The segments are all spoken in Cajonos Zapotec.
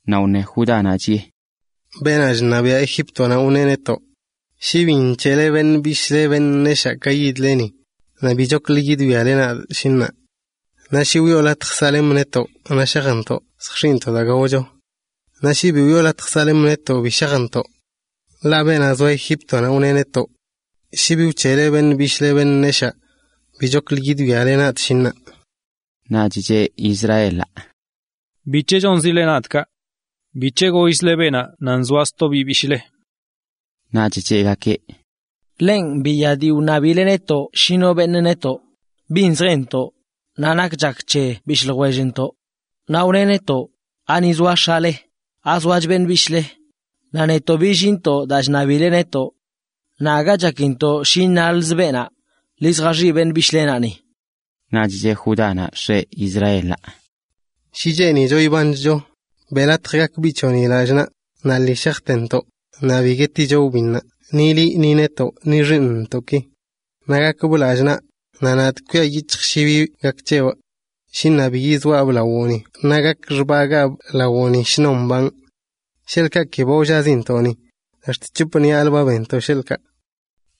Naꞌ wne Judánaꞌ, chiꞌe: ―Beenaꞌ chṉabiaꞌ Egíptonaꞌ wneꞌ netoꞌ: “Shi bi nc̱heꞌle beṉꞌ bishꞌle beṉꞌ neshaa ka yidle ni, naꞌ bichoklə yidwiale nadꞌ, shi ṉaa.” Naꞌ shi wiꞌo latj saꞌlemꞌ netoꞌ naꞌ shajntoꞌ lljx̱iꞌntoꞌ daa gaocho. Naꞌ shi bi wiꞌo latj saꞌlemꞌ netoꞌ, bi shajntoꞌ. Ḻaꞌ beenaꞌ zoa Egíptonaꞌ wneꞌ netoꞌ: “Shi bi wc̱heꞌle beṉꞌ bishꞌle beṉꞌ neshaa, bichchoklə yidwiale nadꞌ, shi ṉaa.” Naꞌch cheꞌ Israelaꞌ: ―¿Bic̱he chonlikzile nadꞌ kaꞌ? ¿Bic̱he gollzle beenaꞌ nan zoa sto biꞌ bishꞌle? Naꞌch cheꞌgakeꞌ: ―Ḻenꞌ biya dii wṉabileꞌ netoꞌ shi no beṉꞌ netoꞌ, bin zjentoꞌ, naꞌ nak chak c̱he bishꞌ ljwellntoꞌ. Naꞌ wneꞌ netoꞌ: “¿Ani zoa x̱ale? ¿Azoach beṉꞌ bishꞌle?” Naꞌ netoꞌ billinntoꞌ daa chṉabileꞌ netoꞌ. Naꞌ aga chakintoꞌ shi iṉalzə beenaꞌ: “Ḻi zjaxiꞌ beṉꞌ bishꞌlenaꞌ ni.” Naꞌch cheꞌ Judánaꞌ x̱eꞌ Israelaꞌ: ―Shi cheenicho ibanchcho, beꞌ latj gak biꞌ c̱hoꞌni lallꞌ naꞌ, naꞌ lii shajtentoꞌ, naꞌ bi gueticho wbinnaꞌ, ni liꞌ ni netoꞌ, ni xiiṉntoꞌki. Naꞌ gakbꞌ lallꞌ naꞌ, naꞌ nadꞌ kwia yic̱hjꞌ shi bi gak c̱hebꞌ. Shi ṉaa bi yizoaꞌbꞌ lawoꞌni naꞌ gakꞌ xbagaabꞌ lawoꞌni shnon mbanꞌ. Sheḻꞌkaꞌ ki ba wllazintoꞌ ni, ax̱t c̱hop ṉiꞌalə ba benntoꞌ sheḻꞌkaꞌ.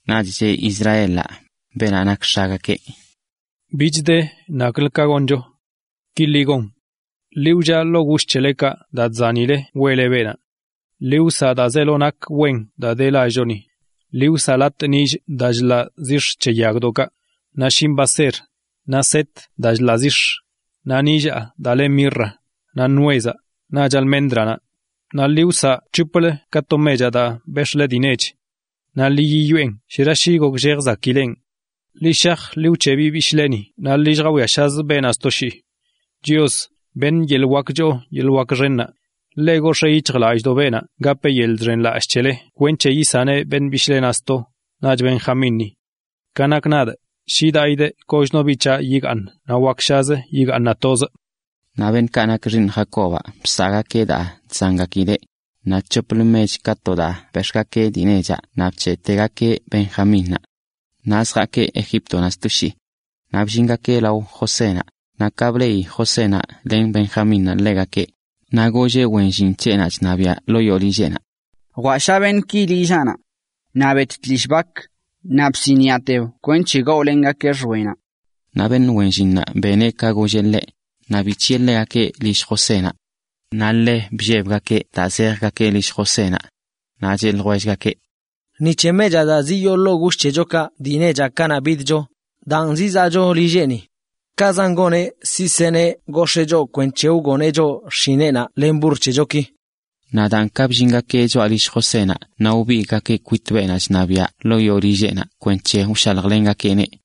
Naꞌch cheꞌ Israelaꞌ, beenaꞌ nak x̱agakeꞌ: ―Bich de naklə ka goncho. Ki ḻi gon: Ḻi wllaꞌ ḻoo gush c̱helekaꞌ daa chzanileꞌ weꞌle beenaꞌ. Ḻi wsaꞌ daa zeelo nakch wen daa de lallchoni. Ḻi wsaꞌ latꞌ nillꞌ daa chḻaꞌ zix̱ c̱he yagdoꞌkaꞌ, naꞌ shinꞌ baser, naꞌ set daa chḻaꞌ zix̱, naꞌ nillaa daa le mirra, naꞌ nuezaꞌ, naꞌch alméndranaꞌ. Naꞌ ḻi wsaꞌ c̱hoplə ka to mechaꞌ daa bex̱ꞌle dii nech. Naꞌ ḻi yiyoꞌen. Shera shi gokllejzigakeꞌn. Ḻi shaj ḻi wc̱heꞌ biꞌ bishꞌleni naꞌ ḻi lljawiashazə beenaꞌ sto shii. Chios, beṉꞌ yeḻꞌ wak choo yeḻꞌ wak xennaꞌ, gox̱ee yic̱hjlallꞌdoꞌ beenaꞌ, naꞌ gapeꞌ yeḻꞌ chiyeshꞌlallꞌ c̱hele kwenc̱he yisaneꞌ beṉꞌ bishꞌlenaꞌ sto, naꞌch Benjamínni. Ka nakꞌ nadꞌ, shi daꞌidꞌ kochno biꞌ c̱haꞌ yigaaṉ naꞌ wakshazə yigaaṉaꞌ tozꞌ. Naꞌ beṉꞌkaꞌ nak xiiṉ Jacobaꞌ bsaꞌgakeꞌ daa chzangakileꞌ, naꞌ c̱hoplə mech ka to daa bex̱ꞌgakeꞌ dii nechaꞌ naꞌ bc̱heꞌtegakeꞌ Benjamínnaꞌ. Naꞌ zjaakeꞌ Egíptonaꞌ sto shii. Naꞌ bllingakeꞌ lao Josénaꞌ, naꞌ ka bleꞌi Josénaꞌ len Benjamínnaꞌ ḻegakeꞌ, naꞌ golleꞌ wen llin c̱heꞌnaꞌ chṉabiꞌa ḻoo yoo lilleꞌnaꞌ: ―Jwaꞌsha beṉꞌki lillaꞌnaꞌ. Naꞌ bet tlishꞌ bak, naꞌ bsiniꞌateb kwenc̱he gaolengakee xwenaꞌ. Naꞌ beṉꞌ wen llinnaꞌ beneꞌ ka golleꞌ ḻeꞌ, naꞌ bic̱hiꞌe ḻegakeꞌ lill Josénaꞌ. Naꞌ ḻe bllebgakeꞌ daa zejgakeꞌ lill Josénaꞌ. Naꞌ cheꞌ ljwellgakeꞌ: ―Ni c̱he mechaꞌ daa ziyoo ḻoo gush c̱hechokaꞌ dii nechaꞌ kanaꞌ bidcho, daan zizaꞌcho lilleꞌni. Kaꞌzan goneꞌ, siꞌ seneꞌ gox̱ee choꞌ kwenc̱he wgoneꞌ choꞌ xshineꞌnaꞌ len burr c̱hechoki. Naꞌ daan ka bllingakeꞌ choꞌa lill Josénaꞌ naꞌ wbigꞌgakeꞌ kwit beenaꞌ chṉabiaꞌ ḻoo yoo lilleꞌnaꞌ kwenc̱he wshaljlengakeꞌneꞌ.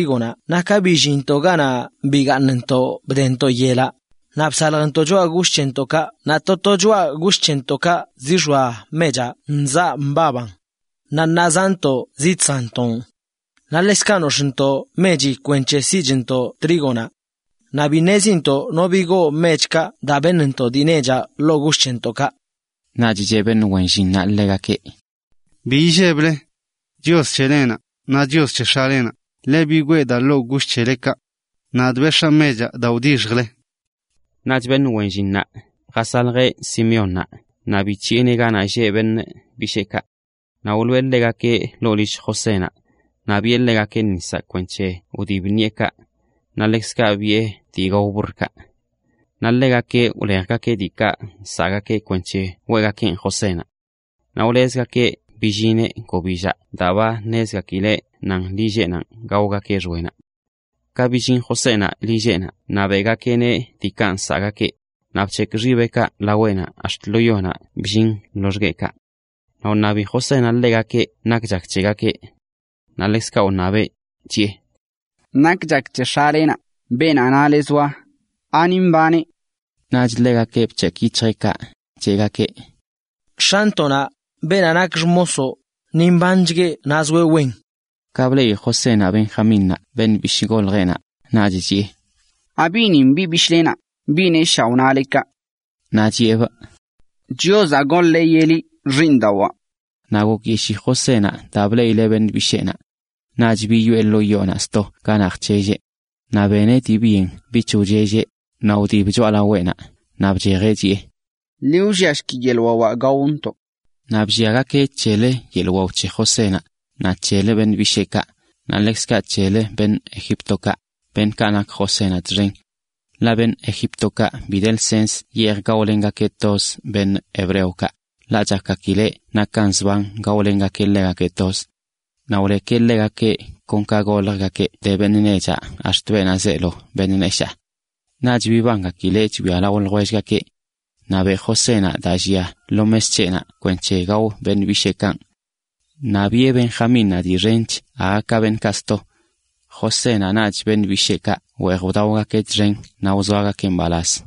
naꞌ ka billinntoꞌ ganaꞌ bigaaṉntoꞌ wdeyintoꞌ yel, naꞌ bsaljntoꞌ choꞌa gush c̱hentoꞌkaꞌ naꞌ to to choꞌa gush c̱hentoꞌkaꞌ zixoa mechaꞌ nzaꞌ mbaban. Naꞌ ṉaa zaꞌntoꞌ zidsanntoꞌn. Naꞌ ḻekzkaꞌ nox̱ꞌchntoꞌ mechi kwenc̱he siꞌchntoꞌ trígonaꞌ. Naꞌ bi ṉezintoꞌ no bigoo mechkaꞌ daa beṉntoꞌ dii nechaꞌ ḻoo gush c̱hentoꞌkaꞌ. Naꞌch cheꞌ beṉꞌ wen llinnaꞌ ḻegakeꞌ: ―Bi illeble. Chios c̱helenaꞌ, naꞌ Chios c̱he x̱alenaꞌ, ḻeꞌ bigwee daa ḻoo gush c̱helekaꞌ. Nadꞌ bex̱aa mechaꞌ daa wdixjle. Naꞌch beṉꞌ wen llinnaꞌ jasaljeꞌ Simeónnaꞌ naꞌ bic̱hiꞌeneꞌ ganaꞌ lleꞌ beṉꞌ bisheekaꞌ. Naꞌ wloꞌe ḻegakeꞌ ḻoo lill Josénaꞌ, naꞌ biꞌe ḻegakeꞌ nisaꞌ kwenc̱he wdib ṉiꞌekaꞌ, naꞌ ḻekzkaꞌ biꞌe dii gao burrkaꞌ. Naꞌ ḻegakeꞌ wlejgakeꞌ diikaꞌ nsaꞌgakeꞌ kwenc̱he weꞌgakeꞌn Josénaꞌ. Naꞌ wlezgakeꞌ billineꞌ gobillaꞌ daa ba ṉezgakileꞌ nan lilleꞌnaꞌ gaogakeꞌ xwenaꞌ. Ka billin Josénaꞌ lilleꞌnaꞌ naꞌ beꞌgakeꞌneꞌ diikaꞌ nsaꞌgakeꞌ, naꞌ bc̱hekꞌ xibeꞌkaꞌ laweꞌnaꞌ ax̱t lo yonaꞌ bllin loxgueꞌkaꞌ. Naꞌ wṉabi Josénaꞌ ḻegakeꞌ nak chak c̱hegakeꞌ. Naꞌ ḻekzkaꞌ wṉabeꞌ, chiꞌe: ―¿Nak chak c̱he x̱alenaꞌ, beenaꞌ nale zoa? ¿Ani mbaneꞌ? Naꞌch ḻegakeꞌ bc̱hekꞌ yic̱hjeꞌkaꞌ, cheꞌgakeꞌ: ―X̱antoꞌnaꞌ, beenaꞌ nak xmosoꞌ, ni mbanchgueꞌ naꞌ zoeꞌ wen. Ka bleꞌi Josénaꞌ Benjamínnaꞌ, beṉꞌ bishꞌ goljeꞌnaꞌ, naꞌch chiꞌe: ―¿Abiꞌnin biꞌ bishꞌlenaꞌ, biꞌ neshaa wnale kaꞌ? Naꞌ chiꞌebꞌ: ―Chiozaꞌ goneꞌ ka gak wen c̱hoꞌ, xiiṉdawaa. Naꞌ gokyeshii Josénaꞌ daa bleꞌileꞌ beṉꞌ bisheenaꞌ. Naꞌch biyoꞌe ḻoo yoonaꞌ sto ganaꞌ jc̱helleꞌ. Naꞌ beneꞌ dii byen bich wchelleꞌ, naꞌ wdib choꞌalaweꞌnaꞌ, naꞌ bchejeꞌ chiꞌe: “Ḻi wlliashki yeḻꞌ wawaꞌ gaontoꞌ.” Naꞌ blliagakeꞌ c̱helə yeḻꞌ wao c̱he Josénaꞌ, naꞌ c̱helə beṉꞌ bisheekaꞌ, naꞌ ḻekzkaꞌ c̱helə beṉꞌ Egíptokaꞌ, beṉꞌkaꞌ nak Josénaꞌ txen. Ḻaꞌ beṉꞌ Egíptokaꞌ bi de lsens yeej gaolengakeꞌ toz hebreokaꞌ, ḻaꞌ chakgakileꞌ nakan zban gaolengakeꞌ ḻegakeꞌ toz. Naꞌ wlekeꞌ ḻegakeꞌ kon ka goljgakeꞌ de beṉꞌ nechaꞌ ax̱t beenaꞌ zeelo beṉꞌ neshaa. Naꞌch bibangakileꞌ chwia lao ljwellgakeꞌ. Naꞌ beꞌ Josénaꞌ daa llia lo mes c̱heꞌnaꞌ kwenc̱he gao beṉꞌ bisheekanꞌ. Naꞌ biꞌe Benjamínnaꞌ dii xench aga ka beṉꞌkaꞌ sto. Josénaꞌ naꞌch beṉꞌ bisheekaꞌ weej wdaogakeꞌ txen naꞌ wzoagakeꞌ mbalaz.